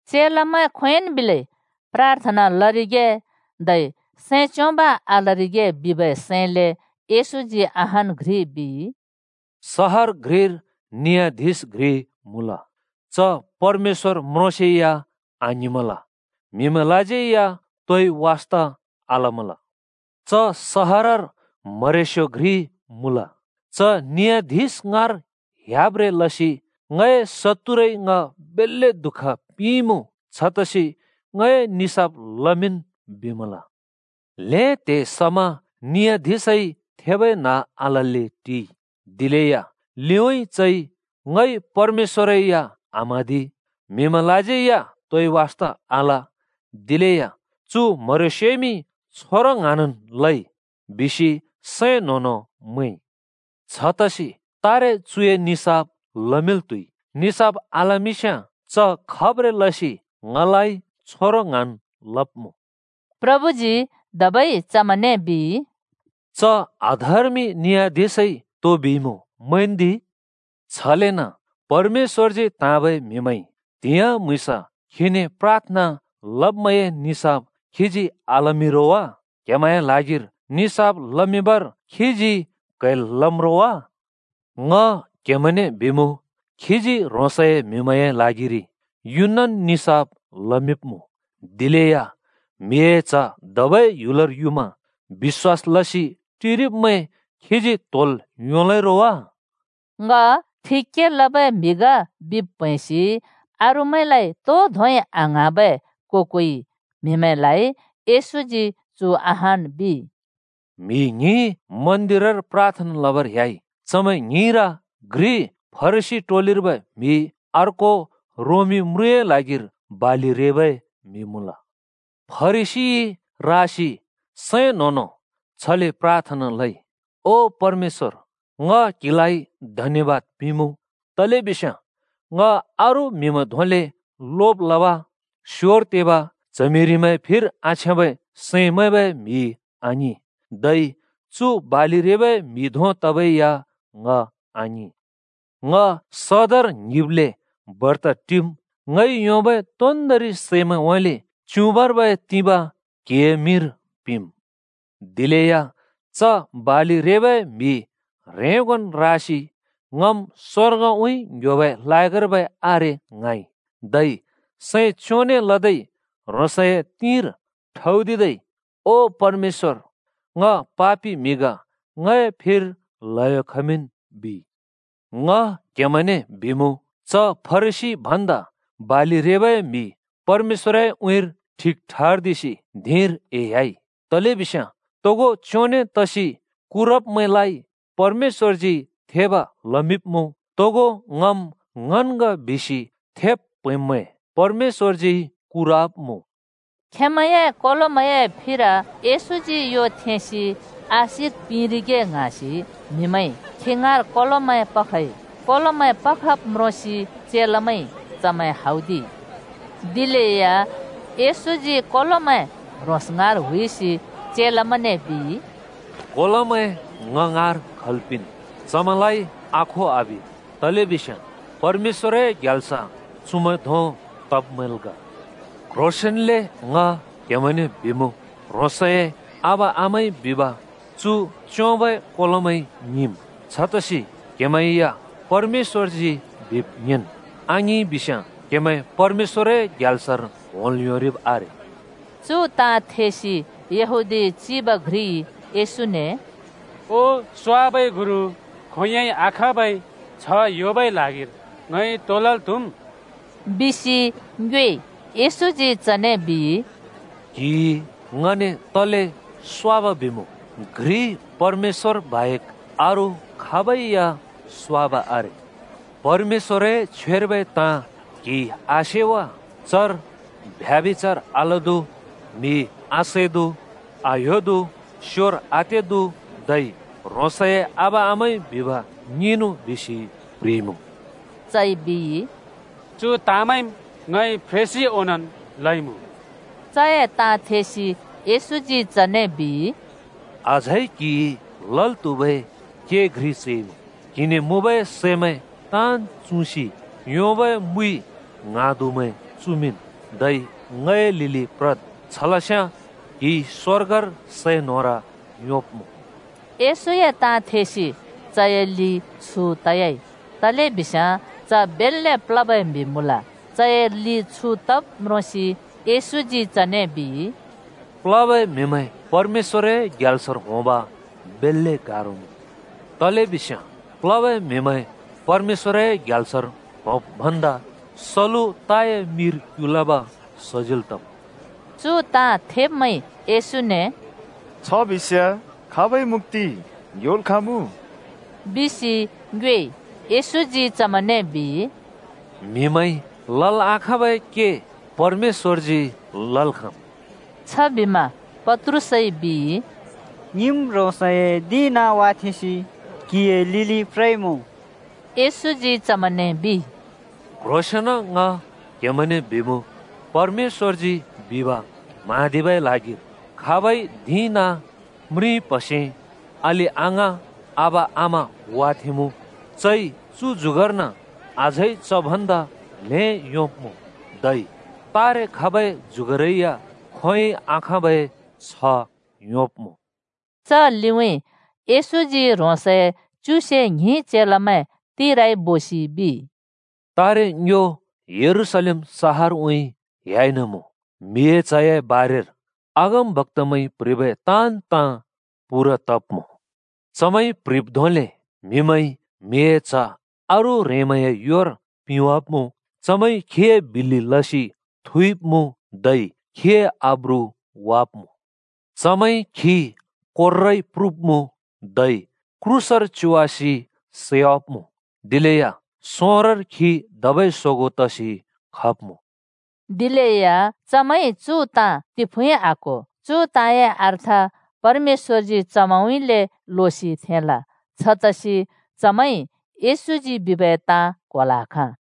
चेलामैं खोंयोंन् बिलै प्राथना लरिगे धै सैं च्योंब आलरिगे बिबै सैंले येशूजी अहान् घ्रि बिइ। “सहर घ्रिर नि‍याधिश घ्रि मुँल। च परमेश्‍वर म्रोंसेया आङ्हिंमल, म्हिमैंलाज्यै या तोइ वास्ता आलमल। च सहरर म्हरेस्‍यो घ्रि मुँल। च नियाधिश ङाँर ह्‍याब्ब्रें लसि ‘ङए शत्तुरइ ङ बेल्‍ले दुःख पिंइमुँ। छतसि ङए निसाफ लमिंन्,’ बिमल। ल्‍हें त्‍हे समा नियाधिशइ थेबै न्ह आलल्‍ले टिइ। दिलेया ‘ङइ परमेश्‍वरै या आम्हाँदि, म्‍हिमैंलाज्यै या तोइ वास्ता आल, दिलेया चु म्हरेस्योइमि छोंरों ङ्हाँनन् लइ,’ बिसि चइ सैं न्हों-न्हों मैंइ। छतसि तारे चुए निसाफ लमिंल् त्‍हुइ। निसाफ आलमिंस्‍याँ च खब्ब्रें लसि ङलाइ छोंरो ङ्हाँन् लब्‍मुँ।” प्रभुजी धबै चमैंने बिइ, “च अधर्मि नियाधिशइ तो बिइमुँ, मैंन्दि। छलेन परमेश्‍वरजी त्हाँबै म्हिमैंइ त्हिंयाँ म्हुँइँस खीने प्राथना लब्मैंए निसाफ खीजी आलमिं रो वा? क्हेमैंए ल्हागिर निसाफ लमिंबर खीजी क्हैल् लम् रो वा? ङ क्हेमैंने बिमुँ, खीजी ह्रोंस‍ए म्हिमैंए ल्हागिरि युनन् निसाफ लमिंब्मुँ। दिलेया म्हिए च्ह धबै ह्‍युलर युमा बिश्‍वास लसि टिरिब्मैं खीजी त्‍होल् योंलै रो वा?” ङ ठिक के लबै म्हि ग बिब् प्हैंसि अरूमैंलाइ तो धोंइ आङ्हाँबै को-कोइ म्हिमैंलाइ येशूजी चु अहान् बिइ, “म्‍हि ङ्हिं मन्दिरर प्राथना लबर ह्‍याइ। चमैं ङ्हिंर घ्रि फरिसी टोलिर्बै म्‍हि, अर्को रोमी म्रुँए ल्हागिर बालि रेबै म्‍हि मुँल। फरिसीइ रासि सैं न्हों-न्हों छले प्राथना लइ, ‘ओ परमेश्‍वर, ङ क्हिलाइ धन्‍यबाद पिंमुँ, तलेबिस्याँ ङ अरू म्‍हिमैं धोंले लोब लब, स्योर तेब, च्हमिरिमैंए फिर आछ्याँबै सैं मैंबै म्हि आङिं, धै चु बालि रेबै म्‍हि धों तबै या ङ आङिं। ङ सदर ङ्हिब्ले बर्त टिम्। ङइ योंबै तोन्दोंरि सैमैंउँइँले च्‍युबाँर्बै तिबाँ क्‍हिए मिंर पिंम्।’ “दिलेया च बालि रेबै म्‍हि ह्रेंगोन् रासि ‘ङम् स्वर्गउँइँ ङ्‌ह्‍योबै लायकर्बै आरे’ ङ्हाँइ। धै सैं च्योंने लदै ह्रोंसए तिंर ठौदिदै ‘ओ परमेश्‍वर, ङ पापि म्‍हि ग। ङए फिर ल्हयो खमिंन्,’ बिइ। “ङ क्हेमैंने बिमुँ, च फरिसी भन्दा बालि रेबै म्‍हि परमेश्‍वरए उँइँर ठिक ठर्दिसि धिंर एह्‍याइ। तलेबिस्याँ तोगो च्योंने तसि कुरब्मैंलाइ परमेश्‍वरजी थेब लमिंब्मुँ। तोगो ङम् ङन् ग बिसि थेब् प्हैंब्मैं परमेश्‍वरजी कुरवाब्‍मुँ।” खेंमैंए कोलोमैंए फिर येशूजी यो थेंसि आशिक पिंरिगे ङ्हाँसि म्हिमैंइ खी ङाँर कोलोमैं पखइ। कोलोमैं पखब् म्रोंसि चेलामैंइ चमैं हौदिइ। दिलेया येशूजी कोलोमैं ह्रोंस ङाँर हुइसि चेलामैंने बिइ, “कोलोमैं ङ ङाँर खल् पिंन्। चमैंलाइ आखो आबिद्, तलेबिस्याँ परमेश्‍वरए ग्याल्स चुमैं धों तब्मैंल् ग। क्ह्रोंसेंन्ले ङ क्हेमैंने बिमुँ, ह्रोंसए आबा-आमाइ बिब चु च्‍योंबै कोलोमैंइ ङिंम्। छतसि क्हेमैं या परमेश्‍वरजी बिब् ङिंन्। आङिंइ बिस्याँ क्हेमैं परमेश्‍वरए ग्याल्सर होंल् योंरिब् आरे।” चु ताँ थेसि यहूदी चिब घ्रिइ येशूने “ओ स्वाबै गुरु! खोंयोंइ आखाँबै छ्ह योंबै ल्हागिर ङइ तो लल् त्‍हुम्?” बिसि ङ्योएइ। येशूजी चने बिइ, “क्‍हिइ ङने तले स्वाब बिमुँ? परमेश्‍वर बाहेक अरू खाबै या स्वाब आरे। परमेश्‍वरए छ्वेर्बै ताँ क्‍हिइ आसे वा? ‘व्यभिचार आलदु, म्‍हि आसैदु, आह्‍योदु, स्‍योर आतेदु धै ह्रोंसए आबा-आमाइ बिब ङिंनु,’ बिसि चर प्‍ह्रिइमुँ,” आङिं वा। चइ बिइ, “चु ताँमैंम् ङइ फ्रेंसि ओंनोंन् लइमुँ।” चए ताँ थेसि येशूजी चने बिइ, “अझै क्‍हिइ लल् त्‍हुबै के घ्रि चैमुँ। क्‍हिने मुँबै सैमैं ताँन् चुँसि योंबै मुइ ङ्हाँदुमैं चुमिंन्, धै ङए लिलि प्रद्, छलस्याँ क्‍हिइ स्‍वर्गर सै न्होर योंब्‍मुँ।” येशूए ताँ थेसि चए लि छु तयाइ। तलेबिस्याँ च बेल्‍ले प्लबै म्हि मुँल। चए लि छु तब् म्रोंसि येशूजी चने बिइ, “प्‍लबै म्‍हिमैं परमेश्‍वर‍ए ग्याल्सर होंब बेल्‍ले गारो मुँ! तलेबिस्याँ प्लबै म्हिमैं परमेश्‍वरए ग्याल्सर होंब् भन्दा सलु (ऊँट) ताए मिर क्युलब सजिल् तम्।” चु ताँ थेब्‍मैंइ “छ बिस्‍याँ खाबइ मुक्‍ति योंल् खाँमुँ?” बिसि येशूने ङ्योएइ। येशूजी चमैंने बिइ, “म्हिमैंइ लल् आखाँबै के परमेश्‍वरजी लल् खाँम्।” छबिमा पत्रुसइ बिइ, “ङिम् ह्रोंसए धिं-नाँ वाथेंसि क्‍हिए लिलि प्रइमुँ।” येशूजी चमैंने बिइ, “क्‍ह्रोंसेंन ङ क्हेमैंने बिमुँ: परमेश्‍वरजी बिब म्हाँदिबै ल्हागिर खाबइ धिं-नाँ, म्रिं-प्‍हसे, अलि-अङाँ आबा-आमा वाथेंमुँ, चइ चु जुगर्न अझै च भन्दा ल्‍हें योंब्‍मुँ। धै तारे खबै जुगरै या खोंयोंइ आखाँबै छ्ह योंब्‍मुँ।” च लिउँइँ येशूजी ह्रोंसए च्युसे ङ्हिं चेलामैं तिराइ बोसि बिइ, “तारे ङ्यो यरूशलेम सहरउइ ह्‍याइन मुँ। म्हिए च्हए बारेर अगमबक्‍तामैंइ प्‍ह्रिबै ताँन् ताँ पूरा तब्मुँ। चमैंइ प्‍ह्रिब् धोंले म्हिमैंइ म्हिए च्ह अरू ह्रेंमैंए योर पिंवाब्‍मुँ। चमैंइ खीए बिल्‍लि लसि थुइब्मुँ धै खीए आब्रु वाब्मुँ। चमैंइ खी कोर्राइ प्रुब्मुँ धै क्रूसर च्योवासि सैवाब्‍मुँ। दिलेया सोंरोर खी धबै सोगों तसि खब्‍मुँ।” दिलेया चेलामैंइ चु ताँ तिफुँइ आक्‍हो। चु ताँए अर्थ परमेश्‍वरजी चमैंउँइँले लोसि थेंइ। छतसि चमैंइ येशूजी बिबै ताँ क्‍होल् आखाँ।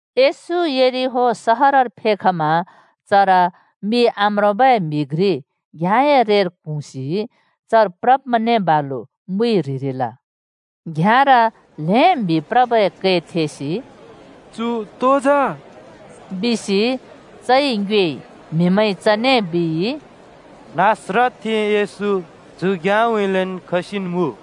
येशू यरिहो सहरर फेखमा चर मि आम्रोंबै म्‍हि घ्रि घ्याँए रेर क्हुँसि चर प्रब्मैंने बालु मुइ ह्रिरिल। घ्‍याँर ल्हें म्हि प्रबै कै थेसि “तो तरिइमुँ जा?” बिसि चइ ङ्योएइ। म्हिमैंइ चने बिइ, “नासरतथें येशू चु घ्‍याँउँइँलेन् खसिन् मुँ।”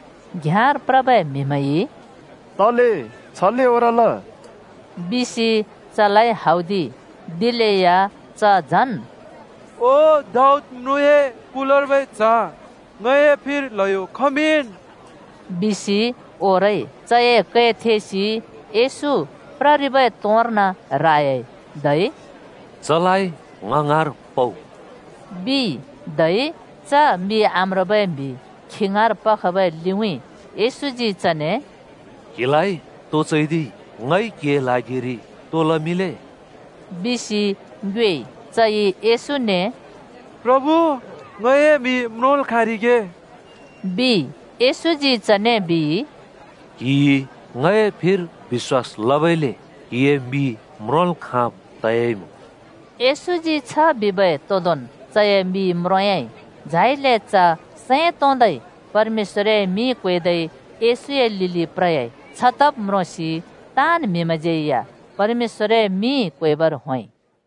घ्याँर प्रबै म्‍हिमैंइ “तले छले ओरल?” बिसि चलाइ हौदिइ। दिलेया “ओ दाऊद म्रुँए कुलर्बै च्ह! ङए फिर ल्हयो खमिंन्,” बिसि च झन् ओरइ। चए कै थेसि येशू प्ररिबै तोंर्न रायाइ, धै “चलाइ ङ ङाँर पउ!” बिइ। धै च मि आम्रोंबै म्‍हि खी ङाँर पखबै लिउँइँ येशूजी चने “क्हिलाइ तो चैदिइ? ङइ क्हिए ल्हागिरि तो लमिंले?” बिसि ङ्योएइ। चइ येशूने “प्रभु ङए मि म्रोंल् खाँरिगे,” बिइ। येशूजी चने बिइ, “क्‍हिइ ङए फिर बिश्‍वास लबइले क्हिए मि म्रोंल् खाँब् तयाइमुँ।” येशूजी छ बिबै तोदोंन् चए मि म्रोंयाँइ। झाइले च सैं तोंदै परमेश्‍वरए मिं क्वेदै येशूए लिलि प्रयाइ। छतब् म्रोंसि ताँन् म्हिमैंज्यै या परमेश्‍वरए मिं क्वेबर होंइ।